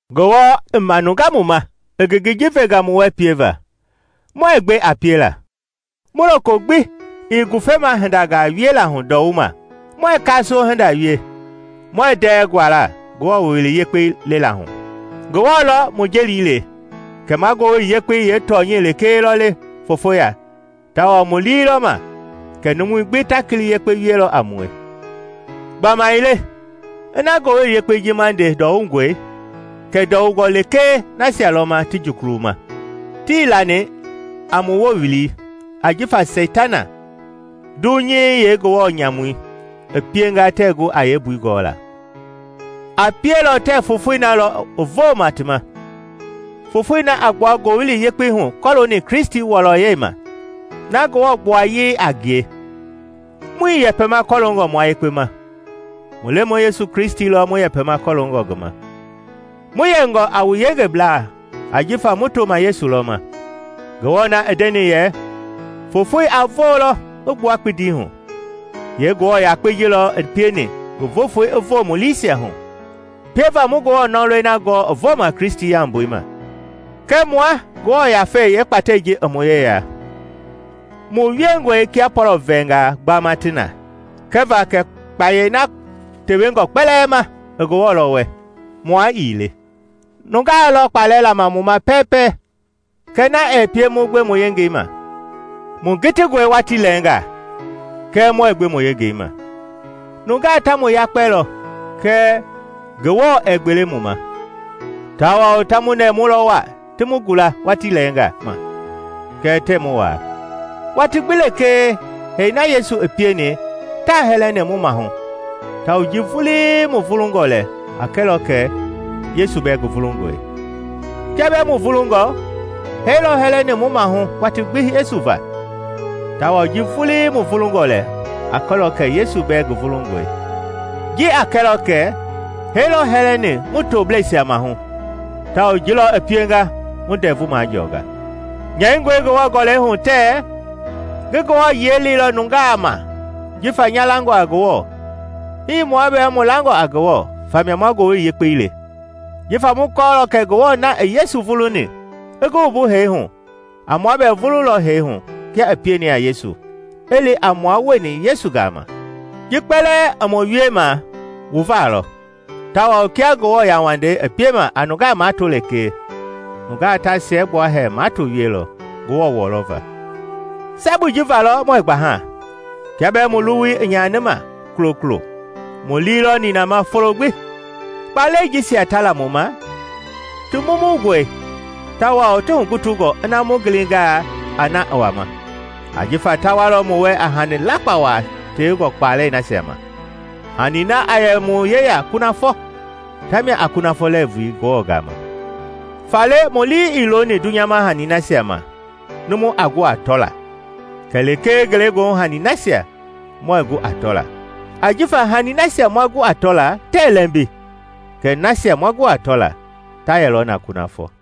Ngewɔ i manunga mu ma i ngengei ji venga mu wɛ pieva, muɛɛ gbe a piela. Mu loko gbi ii ngufema hindangaa wiela hu ndɔwuma, muɛɛ kaasoo hinda wie, muɛɛ ndɛɛ guala Ngewɔ Wowili Yekpei lela hu. Ngewɔ lɔ mu jeli le kɛ ma Ngowili Yekpei yeetɔnyɛi lekee lɔ le fofoya tawao mu lii lɔ ma kɛ numui gbi ta kili yekpe wielɔ a mue. Gbamaile ina Ngowili Yekpei ji ma nde ndɔwungɔe, kɛ ndɔwungɔ lekee nasia lɔ ma ti jukuluma. Tii lani a mu Wowili ajifa Seitana, dunyei yeengewɔ nyamui, i pienga tɛɛ gu a yeembui gɔla. A pielɔ tɛɛ fofoi na lɔ i vooma ti ma, foofoi na a gbua Ngowili Yekpei hu kɔlooni Kristi wɔlɔyɛi ma, na Ngewɔ gbuayei a ngie. Muii yɛpɛma kɔloongɔ mua yekpe ma; mu Lemɔi Yesu Kristi lɔ mu yɛpɛma kɔɔlongɔ ngi ma, mu yɛngɔ a wu yengeblaa jifa mu toma Yesu lɔ ma. Ngewɔ na i ndeni yɛ, “Fofoi a voolɔ i gbua kpindi hu!” yee Ngewɔ yakpei ji lɔ i pieni ngi voofoi i voo mu liisia hu, pieva mu Ngewɔ nɔlɔi na gɔɔ i vooma Kristi yaumbui ma. Kɛɛ mua Ngewɔ Yafei yeekpatɛi ji i mu yeya, mu wiengɔe kia pɔlɔ-vɛɛngaa gbama ti na, kɛva kɛ kpayei na tewengɔ kpɛlɛɛ ma i Ngewɔ lɔ wɛ, mua ii le. Nungaa lɔ kpalɛ lama mu ma pɛɛpɛ, kɛɛ na ɛɛ pie mu gbe mu yengei ma; mu kitingɔe watii lɛɛnga, kɛɛ muɛɛ gbe mu yengei ma; nungaa ta mu yakpelɔ, kɛɛ Ngewɔ ɛɛ gbele mu ma; tawao ta mu nɛɛmulɔ waa ti mu gula watii lɛɛnga ma kɛɛ tɛɛ mu waa. Watii gbi lekee hee na Yesu i pieni taa hɛlɛni mu mahu tawao ji vulii mu vulungɔ lɛ a kɛlɔ kɛ Yesu bɛɛ ngi vulungɔe. Kia bɛɛ mu vulungɔ, hee lɔ hɛlɛni mu maahu watii gbi Yesu va, tawao ji vulii mu vulungɔ lɛ a kɛlɔ kɛ Yesu bɛɛ ngi vulungɔe. Ji a kɛlɔ kɛ hee lɔ hɛlɛni mu toblɛisia mahu tawao ji lɔ i pienga wu ndɛvu majɔɔnga. Nyɛingɔe Ngewɔ Gɔlɛi hu tɛɛ, “Ngi Ngewɔ yiɛi leilɔ nungaa ma jifa nya langɔ a Ngewɔ.” Hii mua bɛɛ mu langɔ a Ngewɔ famia ma Ngowili Yekpei le. Jifa mu kɔɔlɔ kɛ Ngewɔ na i Yesu vuluni i ngi wumbu hee hu, a mua bɛɛ wumbulɔ hee hu kia i pieni a Yesu, i li a mua wieni Yesu gama. Ji kpɛlɛɛ i mu wiema wu va lɔ; tawao kia Ngewɔ yauwandei i piema a nungaa mato lekee, nungaa ta siɛgbua hɛɛ mato wielɔ, Ngewɔ wɔlɔ va. Sabui ji valɔ muɛɛ gbaha. Kia bɛɛ mu luwui i nyanima kulokulo, mu lii lɔ ninama folo gbi. Kpalɛi jisia ta la mu ma ti mumungɔe tawao ti hugutungɔ ina mu gilingaa a na i wama; ajifa ta walɔ mu wɛ a hani lakpa waa tewengɔ kpalɛi nasia ma, hani na a yɛ mu yeya kunafɔ, tamia a kunafɔ lɛɛvui Ngewɔ gama. Faale mu lii ii looni dunyama hani nasia ma numu a gu a tɔla kɛlee ngelegoohu hanii nasia muɛɛ gu a tɔla. Ajifa hanii nasia ma gu a tɔla tɛɛ lɛmbi, kɛɛ nasia muɛɛ gu a tɔla, ta yɛlɔ na kunafɔ.